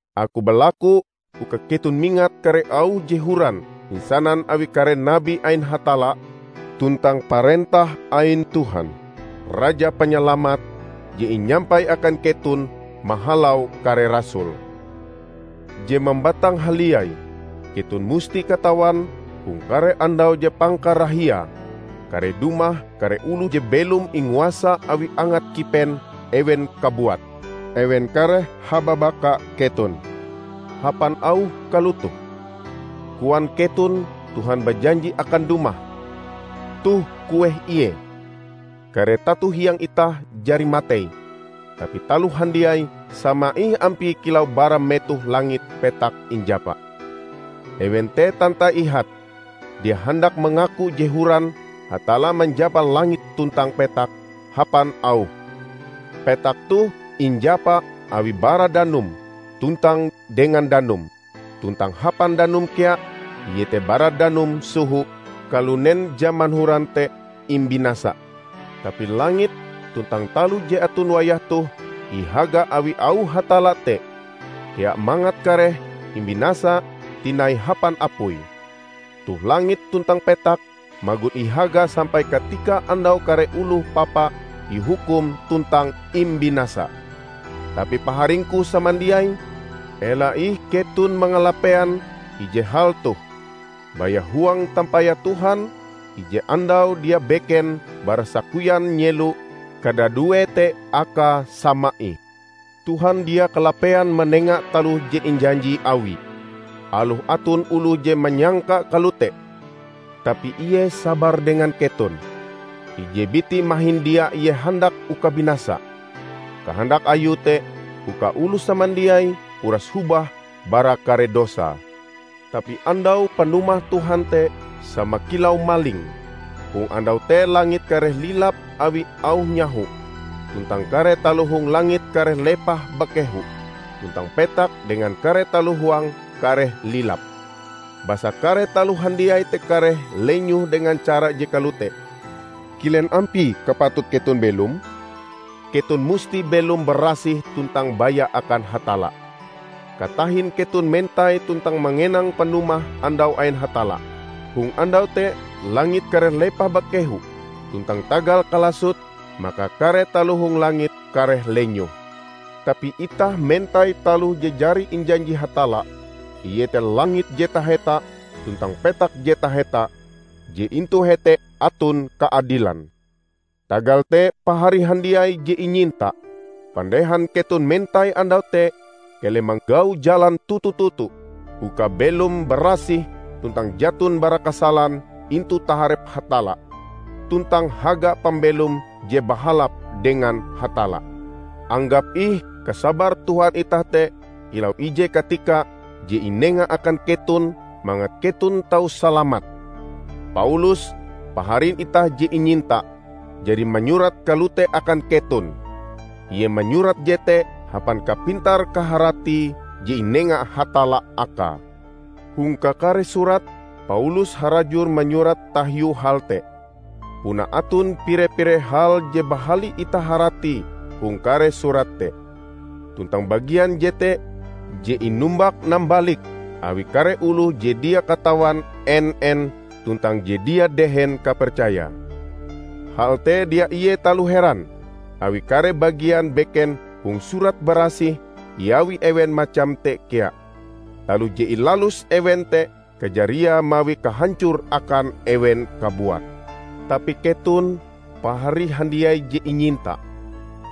Aku balaku uka keton mingat kare auh je horan inasanan awi kare nabi ain Hatalla, tuntang parentah ain Tuhan, Raja Panyalamat, je inyampai akan keton mahalau kare rasul. Je mambatang haliai, keton musti katawan hong kare andau je pangkarahiae, kareh dumah kare oloh je belom inguasa awi angat kipen ewen kabuat. Ewen kareh hababaka keton hapan auh kalotoh, "Koan keton Tuhan bajanji akan dumah! Toh kueh ie? Kare tato hiang itah jari matei, tapi taloh handiai sama ih ampie kilau bara metoh langit petak injapa!" Ewen te tantai ihate dia handak mangaku je horan Hatalla manjapa langit tuntang petak hapan Auhe. Petak toh injapa Awie bara danum, tuntang dengan danum; tuntang hapan danum kea -- iete bara danum soho -- kalunen jaman horan te imbinasa. Tapi langit tuntang taloh je aton wayah toh, ihaga awi auh Hatalla te kea mangat kareh imbinasa tinai hapan apui. Toh langit tuntang petak magon ihaga sampai katika andau kare oloh papa ihukum tuntang imbinasa. Tapi paharingku samandiai, ela ih keton mangalapean ije hal toh: baya huang tampayah Tuhan, ije andau dia beken bara sakoyan nyelo -- kadaduee te akae sama ih. Tuhan dia kalapean manenga taloh je injanji Awie, aloh aton oloh je manyangka kalote. Tapi ie sabar dengan keton, ije biti mahin dia ie handak uka binasa. Kahandak Ayue te uka oloh samandiai uras hobah bara kare dosae. Tapi Andau panumah Tuhan te sama kilau maling. Hong andau te langit kareh lilap awi auh nyaho, tuntang kare taloh hong langit kareh lepah bakehu, tuntang petak dengan kare taloh huange kareh lilap. Basa kare taloh handiai te kareh lenyoh dengan cara je kalote, kilen ampie kapatut keton belom? Keton musti belom barasih tuntang baya akan Hatalla, katahin keton mentai tuntang mangenang panumah Andau ain Hatalla. Hong Andau te langit kareh lepah bakehu, tuntang tagal kalasote, maka kare taloh hong langit kareh lenyoh. Tapi itah mentai taloh je jari injanji Hatalla, iete langit je taheta tuntang petak je taheta, je intu hete aton kaadilan. Tagal te pahari handiai je inyinta, pandehan keton mentai Andau te, keleh manggau jalan toto-toto uka belom barasih tuntang jaton bara kasalan intu taharep Hatalla. Tuntang haga pambelom je bahalap dengan Hatalla. Anggap ih kasabar Tuhan itah te kilau ije katika je inenga akan keton mangat keton tau salamat. Paulus, paharin itah je inyinta, jari manyurat kalote akan keton. Ie manyurat jete hapan kapintar-kaharati je inenga Hatalla akae. Hong kakare surate, Paulus harajur manyurat tahiu hal te. Puna aton pire-pire hal je bahali itah haratie hong kare surate te. Tuntang bagian jete je inumbak-nambalik awi kare oloh je dia katawan en-en tuntang je dia dehen kapercayae. Hal te dia ie taloh heran, awi kare bagian beken hong Surat Barasih iawi ewen macam te kea. Taloh je ilalus ewen te kajariae mawi kahancor akan ewen kabuat. Tapi keton, pahari handiai je inyinta,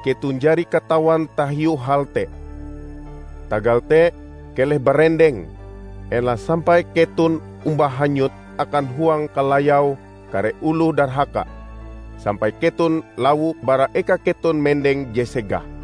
keton jari katawan tahiu hal te. Tagal te keleh barendeng, ela sampai keton omba hanyut akan huang kalayau kare oloh darhaka sampai keton lawo bara eka keton mendeng je segah.